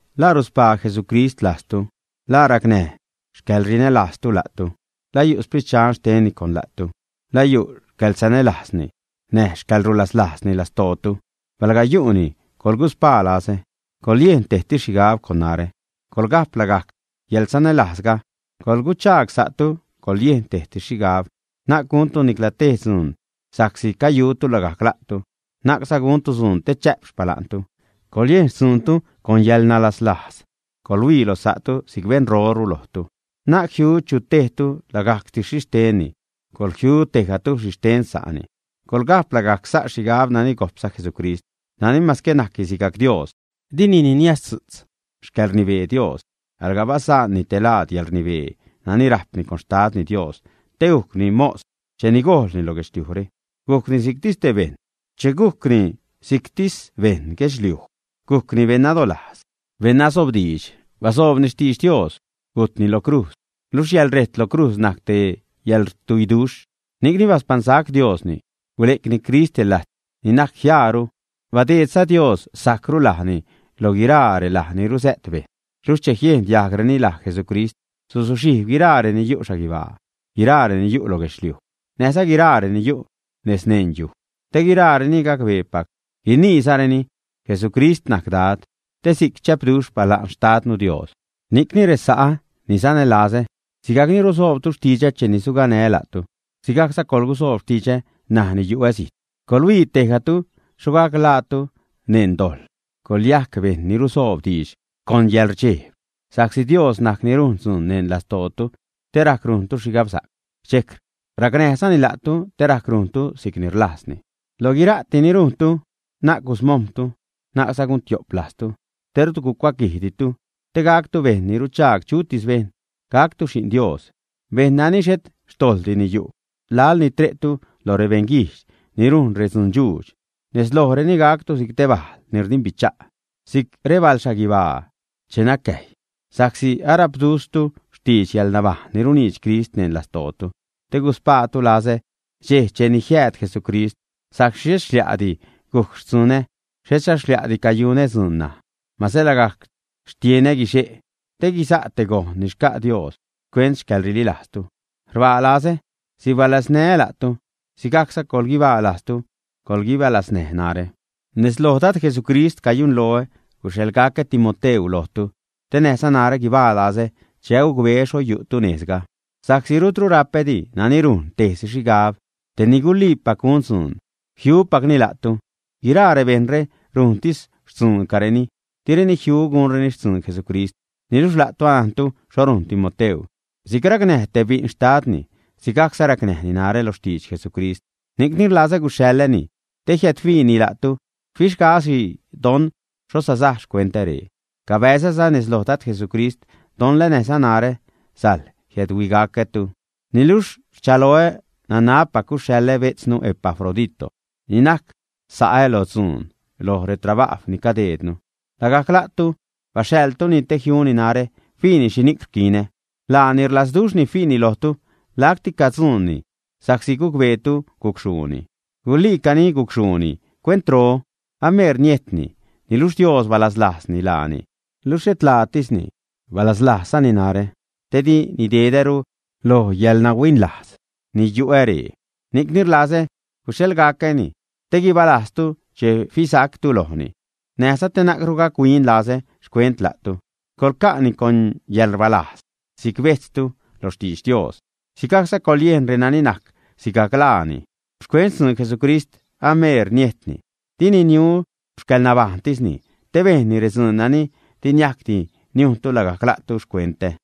¿La ruspaa Jesucrist lajztu? ¿La racnäj xcäḻrinälajztu la'tu? ¿La yu' Sprit Dxan xtenni con la'tu? ¿La yu' xcäḻsanälajzni näj xcäḻrulaslajzni lastootu? Palga yu'ni, coḻguspaa lazä, coḻyejn tejsi xhigab con narä, coḻga'p lagajc yäḻsanälajzga, coḻguidxaag sa'tu, coḻyejn tejsi xhigab. Na'c guntu nicla tej dzuun sa'csi cayutu lagajc la'tu, na'cza guntu dzuun te chä'p xpala'ntu. Coḻyejn xtzuuntu con yäḻnalaslajz, coḻhuii loj sa'tu si'c beṉroru lojtu. Na'c jiu chu tejtu lagajctis xhixtenni, coḻjiu tejgatu xhixten sa'ni. Coḻga'p lagajc sa' xhigab nani gojpza Jesucrist nani mase najcni sigajc Dios, dini niniazdzu'tz xcäḻrnibee Dios, alga basa'nni te laad yäḻrnibee nani rajpni con Xtadni Dios te gujcni mos cheni gojlni lo guedxliujre. Gujcni si'ctis te bejṉ. Che gujcni si'ctis beṉ guedxliuj, gujcni beṉ nadolajz, beṉ nasobdiidx. Basoobni xtidx Dios, gujtni lo crujz, luxh yäḻrejt lo crujz najc te yäḻrtuiduxh. Ni'cni baspaṉsac Diosni, gule'cni Crist te lajt ni najc jiaaru, badeedza Dios sajcru lajni lo laj guiraa relaj ni rusä't bejṉ. Luxh che jiejn diajgreni laj Jesucrist, suzuxhijb guiraa reni yu' xhaguibaa, guiraa reni yu' lo guedxliuj, näjza guiraa reni yu' nez neṉ yuj. Te guiraareni gacbeepac, guiniizareni: “Jesucrist najc Dad”, te si'c chä'pduxh xpala'n Xtadnu Dios. Ni'cni, resa'ä ni sanälazä, sigajcni rusoobtu xtidxä cheni suganää́ la'tu, sigajcza coḻgusoob xtidxä ṉaj ni yu'ä zijt, coḻhuii tejgatu xho gac ḻaatu neṉ dojḻ, coḻyajc bejṉ ni rusoob diidx con yäḻrdxejb. Sa'csi Dios najc ni rujn dzuun neṉ lastootu te rajc rujntu xhigabsa'c, dxejc racnäjzani la'tu te rajc rujntu si'cni rlajzni. Loj guira'ti ni rujntu, na'c gusmojm̲tu, na'cza gun tiop lajztu, te rut gucuaquijditu, te gactu bejṉ ni ruchaag chutis bejṉ, gactu xi'n Dios, bejṉ nani xhet xtojḻdini yu' laḻ ni tre'tu loj rebeṉguijdx ni rujn redzundxuudx. Nez lojreni gactu si'c te bajl ni rdimbicha' si'c rebalxhaguibaa che nacäjy, sa'csi arapdzu'tztu xtidx yäḻnabajṉ ni runiidx Crist neṉ lastootu te guspaatu lazä dxej cheni jiääd Jesucrist, sa'csi xhet xlia'di gujc xtzunä, xhetza xlia'di cayunä dzuun ṉaj. Mase lagajc xtienä guixe' te guiza' te gojn ni xca' Dios xcuent xcäḻrililajztu, rbaa lazä, sibalaznää́za la'tu. Sigajcza coḻguibaa lajztu, coḻguibalaznäj narä. Nez loj Dad Jesucrist cayunloä guxhaḻgacä Timoteu lojtu te näjza narä guibaa lazä che agucbeä xho yu'tu nejzga. Sa'csi rutru rapädi nani rujn tejsi xhigab, tej ni guliipac gun dzuun, jiupacni la'tu. Guiraa rebejṉre rujntis xtzuuncareni, direni jiu gunreni xtzuun Jesucrist. Niluxh la'tu anajntu xho rujn Timoteu; si'c racnäj te bi'n xtadni, si'cza racnäjni narä lo xtidx Jesucrist. Ni'cni rlazä guxhaḻäni te jiädhuiini la'tu, fixgaä́si don xho sasaj xcuentä ree. Cabäzäza nez lo Dad Jesucrist don la näjza narä sajl jiädhuigacätu. Niluxh rchaloä nanabpac guxhaḻä bejtznu Epafrodito ni najc sa'ä loj dzuun, loj retrabajw ni cadejdnu. Lagajc la'tu baxhaḻtuni te jiuni narä, fiini xhini'c rquinä. Laani rlazduxhni fiini lojtu, lacti cayu'ni yärsia' sa'csi gucbeetu gucxhuuni. Guliica gucxhuuni cuentro, ameer niejtni, niluxh Dios balaslajzni laani, luxh xhet laatisni, balaslajzzani narä te di nidedäru loj yäḻnahuinlajz ni yu'ä ree. Ni'cni rlazä guxhaḻgacäni te guibalajztu che fisactu lojni, näjza te na'cru gac-huinlazä xcuent la'tu. Coḻca'ni con yäḻrbalajz si'c bejtztu lo xtidx Dios, sigajcza coḻyejn reni najc sigajc laani. Xcuent xtzuun Jesucrist ameer niejtni, dini niu xcäḻnabajṉtisni te bejnni redzuun nani di niajcdi niujntu lagajc la'tu xcuentä.